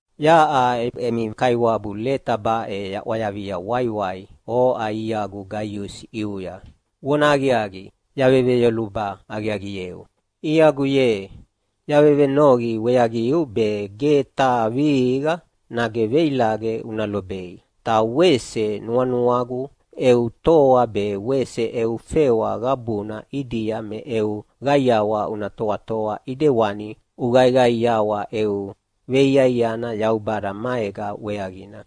Yaʼa emi kaiwabu leta baʼe yaʼwayavia waiwai oʼa iagu Gaiusi ʼiuya. Vonahaqiaqi, yaveyoluba aqiaqieu. Iagu ye, yavevenoqi weaqiu be ge taha vihiqa nage veilaqe una lobei, ta wese nuanuagu eu toa be wese eu fewa qabuna ʼidia me eu qaiawa una toatoa ʼidewani uqaiqaiawa eu veiaiana Yaubada maega weaqina.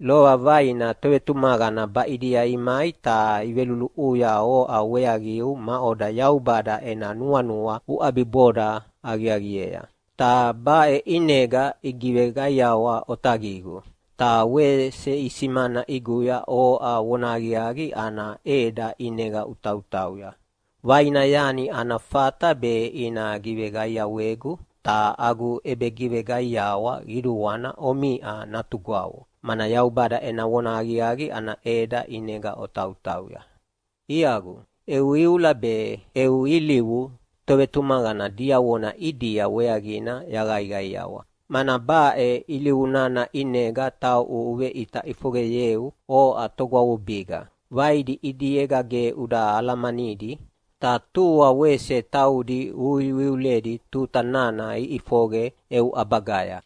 Lova vaina tovetumaqana baʼidia imai ta iveluluʼuya oʼa weaqiu maʼoda Yaubada ena nuanua uʼabiboda aqiaqiea. Ta baʼe ʼinega igiveqaiawa otaqigu, ta wese isimana ʼiguya oʼa vonahaqiaqi ana ʼeda ʼinega utautauya. Vaina yani ana fata be ina giveqaiawegu, ta agu ʼebegiveqaiawa qiduana omiʼa natugwavo, mana Yaubada ena vonahaqiaqi ana ʼeda ʼinega otautauya. Iagu, eu iula be eu ilivu tovetumaqana diavona ʼidia weaqina yaqaiqaiawa, mana baʼe ilivu nana ʼinega tauʼu uveʼita ʼifoqeyeu oʼa togwavubiga. Vaidi ʼidiega ge uda alamanidi, ta tua wese taudi uiuiuledi tuta nana iʼifoqe eu ʼabagaya.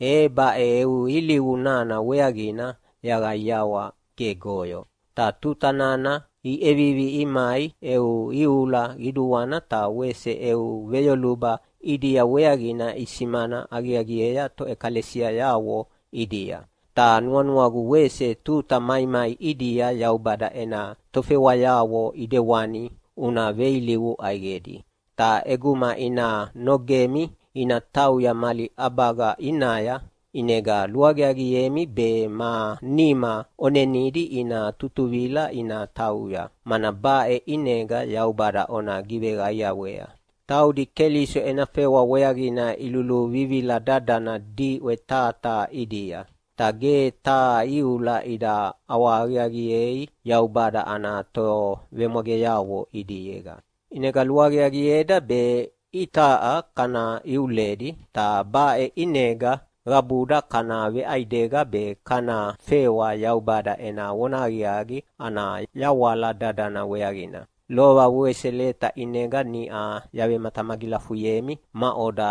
E baʼe eu ilivu nana weaqina yaqaiawa gegoyo. Ta tuta nana iʼevivi imai eu iula qiduana ta wese eu veyoluba ʼidia weaqina isimana aqiaqiea toʼekalesiayavo ʼidia. Ta nuanuagu wese tuta maimai ʼidia Yaubada ena tofewayavo ʼidewani una veilivu ʼaiqedi. Ta ʼeguma ina nogemi ina tauya mali ʼabaga ʼinaya, ʼinega luaqiaqiemi be ma nima ʼonenidi ina tutuvila ina tauya, mana baʼe ʼinega Yaubada ona giveqaiawea. Taudi Keliso ena fewa weaqina iluluvivila dadana diʼwe taha taha ʼidia, ta ge taha iula ida ʼawahaqiaqiei Yaubada ana tovemwageavo ʼidiega. ʼInega luaqiaqieda be itaʼa kana iuledi, ta baʼe ʼinega qabuda kana veʼaidega be kana fewa Yaubada ena vonahaqiaqi ana yawala dadana weaqina. Lova wese leta ʼinega niʼa yavematamagilafuyemi maʼoda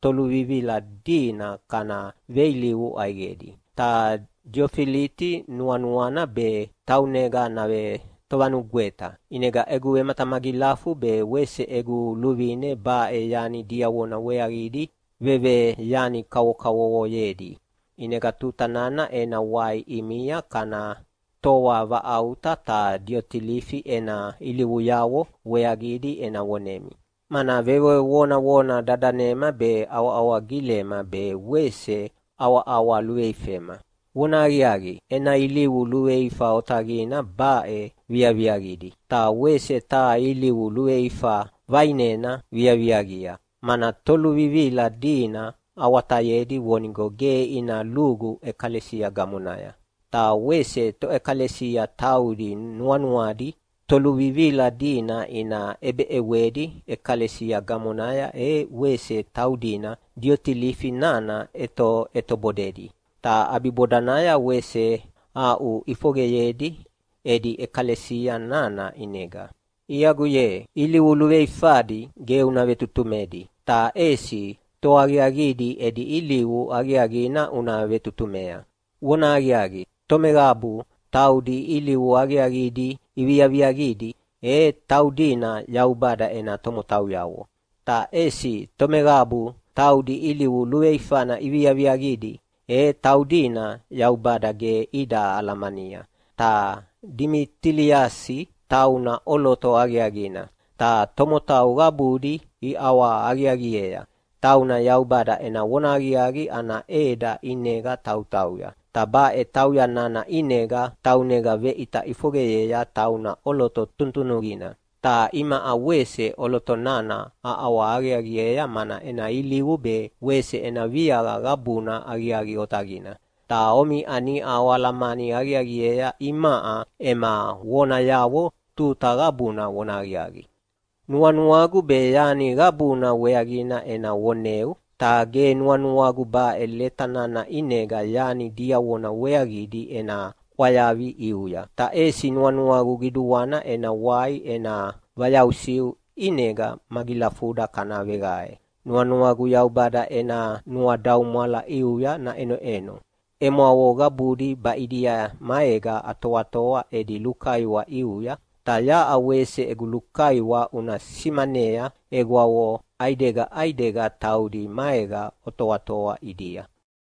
toluvivila dina kana veilivu ʼaiqedi, ta Diotilifi nuanuana be taunega navetovanugweta, ʼinega egu vematamagilafu be wese egu luvine baʼe yani diavona weaqidi veveyani kavokavovoyedi. ʼInega tuta nana ena wai ʼimia kana toavaʼauta ta Diotilifi ena ilivuyavo weaqidi ena vonemi, mana vevevonavona dadanema be, awahawa gilema be wese ʼawaʼawa luveifema. Vonahaqiaqi, ena ilivu luveifa otaqina baʼe viaviaqidi. Ta wese taha ilivu luveifa vaʼinena viaviaqia, mana toluvivila dina awatayedi vonigo ge ina lugu ʼekalesia gamonaya, ta wese toʼekalesia taudi nuanuadi toluvivila dina ina ʼebeʼewedi ʼekalesia gamonaya e wese taudina Diotilifi nana ʼetoʼetobodedi, ta ʼabibodanaya wese aʼuʼifoqeyedi edi ʼekalesia nana ʼinega. Iagu ye, ilivu luveifadi ge una vetutumedi, ta ʼesi toaqiaqidi edi ilivu aqiaqina una vetutumea. Vonahaqiaqi, tomeqabu taudi ilivu aqiaqidi iviaviaqidi, e taudina Yaubada ena tomotauyavo. Ta ʼesi tomeqabu taudi ilivu luveifana iviaviaqidi, e taudina Yaubada ge ida alamania. Ta Dimitiliasi tauna ʼoloto aqiaqina, ta tomotau qabudi iʼawahaqiaqiea. Tauna Yaubada ena vonahaqiaqi ana ʼeda ʼinega tautauya, ta baʼe tauya nana ʼinega taunega veʼita ʼifoqeyea tauna ʼoloto tunutunuqina. Ta imaʼa wese ʼoloto nana aʼawahaqiaqiea mana ena ilivu be wese ena viaqa qabuna aqiaqi otaqina. Ta omiʼa niʼa oalamani aqiaqiea imaʼa ema vonayavo tuta qabuna vonahaqiaqi. Nuanuagu be yani qabuna weaqina ena voneu, ta ge nuanuagu baʼe leta nana ʼinega yani diavona weaqidi ena ʼwayavi ʼiuya. Ta ʼesi nuanuagu qiduana ena wai ena vayausiu, ʼinega magilafuda kana veqae. Nuanuagu Yaubada ena nuadaumwala ʼiuya naʼenoʼeno. Emwavo qabudi baʼidia maega atoatoa edi lukaiwa ʼiuya. Ta yaʼa wese egu lukaiwa una simanea egwavo ʼaidega ʼaidega taudi maega otoatoa ʼidia.